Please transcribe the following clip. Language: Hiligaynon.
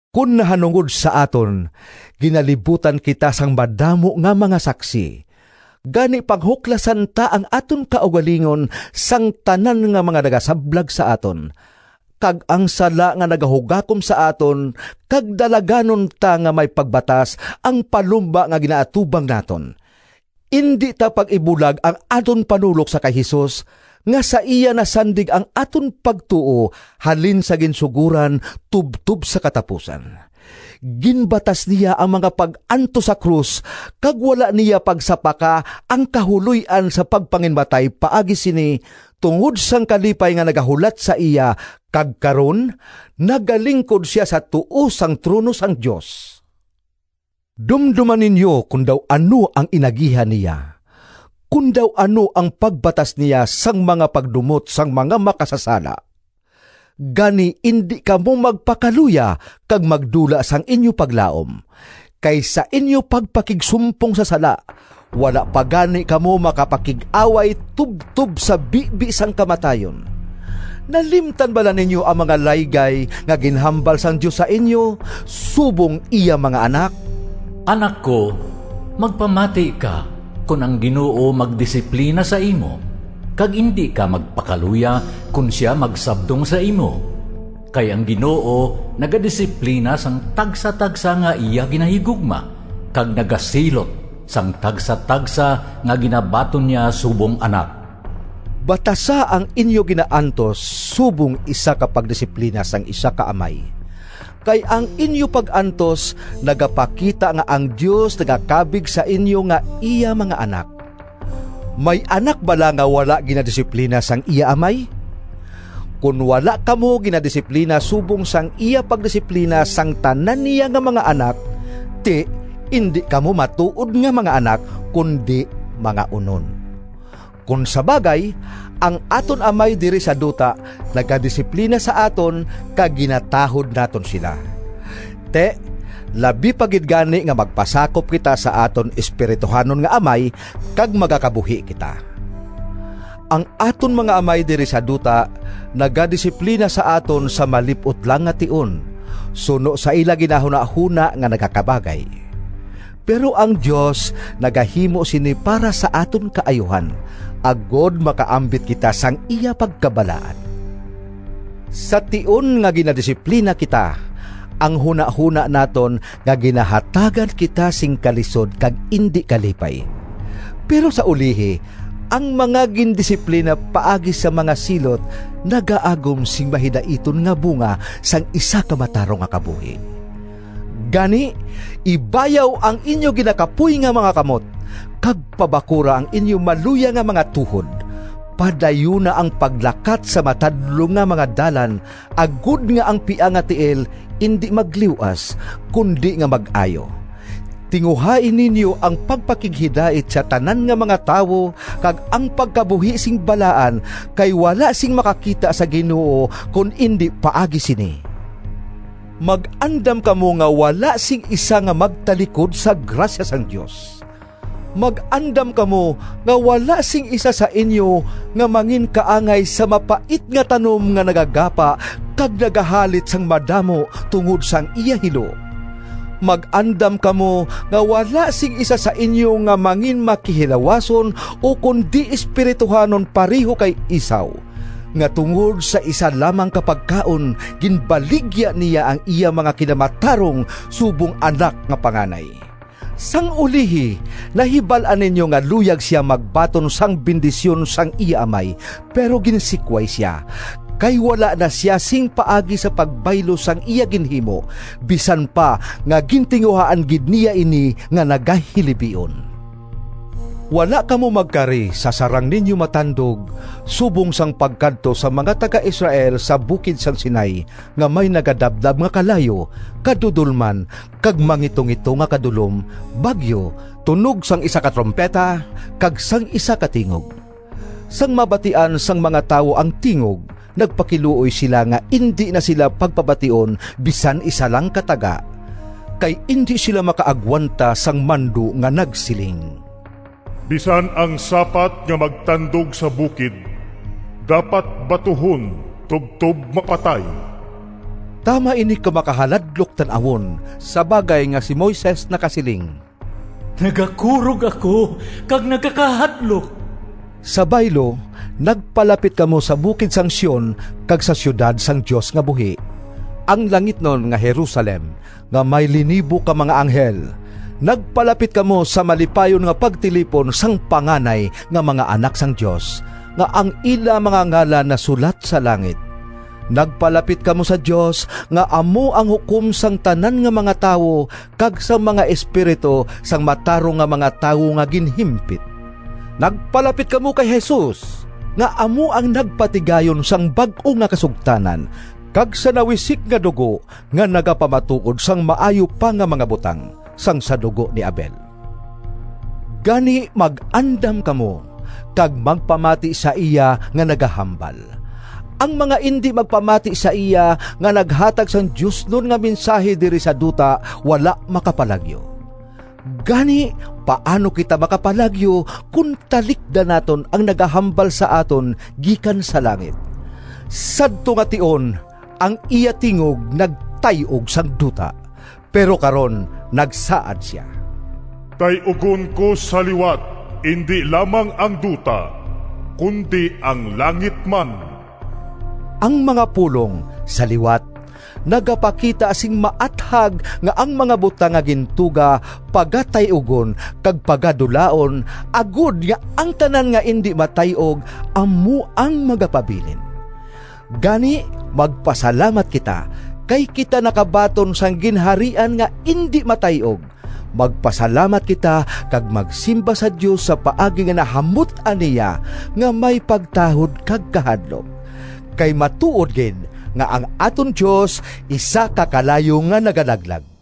Kon nahanungod sa aton, ginalibutan kita sang madamo nga mga saksi. Gani panghuklasan ta ang aton kaugalingon sang tanan nga mga nagasablag sa aton, kag ang sala nga nagahugakom sa aton, kag dalaganon ta nga may pagbatas ang palumba nga ginaatubang naton. Indi ta pag-ibulag ang aton panulok sa kay Jesus, nga sa iya nasandig ang aton pagtuo halin sa ginsugoran tubtob sa katapusan. Ginbatas niya ang mga pag-antos sa krus kag wala niya pagsapaka ang kahuloy-an sa pagpanginmatay paagi sini, tungod sang kalipay nga nagahulat sa iya, kag karon nagalingkod sia sa tuo sang trono sang Dios. Dumdoma ninyo kon daw ano ang inagihan niya, kon daw ano ang pagbatas niya sang mga pagdumot sang mga makasasala! Gani indi kamo magpakaluya kag magdula sang inyo paglaom. Kay sa inyo pagpakigsumpong sa sala, wala pa gani kamo makapakig-away tubtob sa bibi sang kamatayon. Nalimtan bala ninyo ang mga laygay nga ginhambal sang Dios sa inyo subong iya mga anak? “Anak ko, Magpamati ka Kon ang Ginoo magdisiplina sa imo, Kag indi ka magpakaluya Kon sia magsabdong sa imo. Kay ang Ginoo nagadisiplina Sang tagsatagsa nga iya ginahigugma, Kag nagasilot sang tagsatagsa Nga ginabaton niya subong anak.” Batasa ang inyo ginaantos subong isa ka pagdisiplina sang isa ka amay. Kay ang inyo pag-antos nagapakita nga ang Dios nagakabig sa inyo nga iya mga anak. May anak bala nga wala ginadisiplina sang iya amay? Kon wala kamo ginadisiplina subong sang iya pagdisiplina sang tanan niya nga mga anak, ti, indi kamo matuod nga mga anak, kundi mga onon. Kon sa bagay ang aton amay diri sa duta nagadisiplina sa aton, kag ginatahod naton sila. Ti, labi pa gid gani nga magpasakop kita sa aton espirituhanon nga Amay kag magakabuhi kita! Ang aton mga amay diri sa duta nagadisiplina sa aton sa malip-ot lang nga tion, suno sa ila ginahunahona nga nagakabagay. Pero ang Dios nagahimo sini para sa aton kaayuhan, agod makaambit kita sang iya pagkabalaan. Sa tion nga ginadisiplina kita, ang hunahona naton nga ginahatagan kita sing kalisod kag indi kalipay. Pero sa ulihi, ang mga gindisiplina paagi sa mga silot nagaagom sing mahidaiton nga bunga sang isa ka matarong nga kabuhi. Gani ibayaw ang inyo ginakapoy nga mga kamot, kag pabakura ang inyo maluya nga mga tuhod! Padayuna ang paglakat sa matadlong nga mga dalan, agod nga ang piang nga tiil indi magliw-as, kundi nga mag-ayo. Tinguhai ninyo ang pagpakighidait sa tanan nga mga tawo, kag ang pagkabuhi sing balaan, kay wala sing makakita sa Ginoo kon indi paagi sini. Mag-andam kamo nga wala sing isa nga magtalikod sa grasya sang Dios. Mag-andam kamo nga wala sing isa sa inyo nga manginkaangay sa mapait nga tanom nga nagagapa kag nagahalit sang madamo tungod sang iya hilo. Mag-andam kamo nga wala sing isa sa inyo nga manginmakihilawason ukon di-espirituhanon pareho kay Esau, nga tungod sa isa lamang ka pagkaon ginbaligya niya ang iya mga kinamatarong subong anak nga panganay. Sang ulihi, nahibal-an ninyo nga luyag sia magbaton sang bendisyon sang iya amay, pero ginsikway sia, kay wala na sia sing paagi sa pagbaylo sang iya ginhimo, bisan pa nga gintinguhaan gid niya ini nga nagahilibion. Wala kamo magkari sa sarang ninyo matandog, subong sang pagkadto sang mga taga-Israel sa bukid sang Sinai nga may nagadabdab nga kalayo, kadudolman kag mangitungito nga kadulom, bagyo, tunog sang isa ka trumpeta, kag sang isa ka tingog. Sang mabatian sang mga tawo ang tingog, nagpakiluoy sila nga indi na sila pagpabation bisan isa lang ka taga, kay indi sila makaagwanta sang mando nga nagsiling, “Bisan ang sapat nga magtandog sa bukid dapat batuhon tubtob mapatay.” Tama ini ka makahaladlok tan-awon sa bagay nga si Moises nakasiling, “Nagakurog ako kag nagakahadlok!” Sa baylo, nagpalapit kamo sa bukid sang Sion kag sa siyudad sang Dios nga buhi, ang langitnon nga Jerusalem, nga may linibo ka mga anghel. Nagpalapit kamo sa malipayon nga pagtilipon sang panganay nga mga anak sang Dios, nga ang ila mga ngalan nasulat sa langit. Nagpalapit kamo sa Dios, nga amo ang hukom sang tanan nga mga tawo, kag sa mga espiritu sang matarong nga mga tawo nga ginhimpit. Nagpalapit kamo kay Jesus, nga amo ang nagpatigayon sang bag-o nga kasugtanan, kag sa nawisik nga dugo nga nagapamatuod sang maayo pa nga mga butang sang sa dugo ni Abel. Gani mag-andam kamo, kag magpamati sa iya nga nagahambal. Ang mga indi magpamati sa iya nga naghatag sang diosnon nga mensahi diri sa duta wala makapalagyo. Gani paano kita makapalagyo, kon talikdan naton ang nagahambal sa aton gikan sa langit! Sadto nga tion ang iya tingog nagtay-og sang duta, pero karon nagsaad sia, “Tay-ugon ko sa liwat indi lamang ang duta, kundi ang langit man.” Ang mga pulong “sa liwat” nagapakita sing maathag nga ang mga butang nga gintuga pagatay-ugon kag pagadulaon, agod nga ang tanan nga indi matay-og amo ang magapabilin. Gani, magpasalamat kita, kay kita nakabaton sang ginharian nga indi matay-og. Magpasalamat kita kag magsimba sa Dios sa paagi nga nahamut-an niya, nga may pagtahod kag kahadlok. Kay matuod gid nga ang aton Dios isa ka kalayo nga nagalaglag.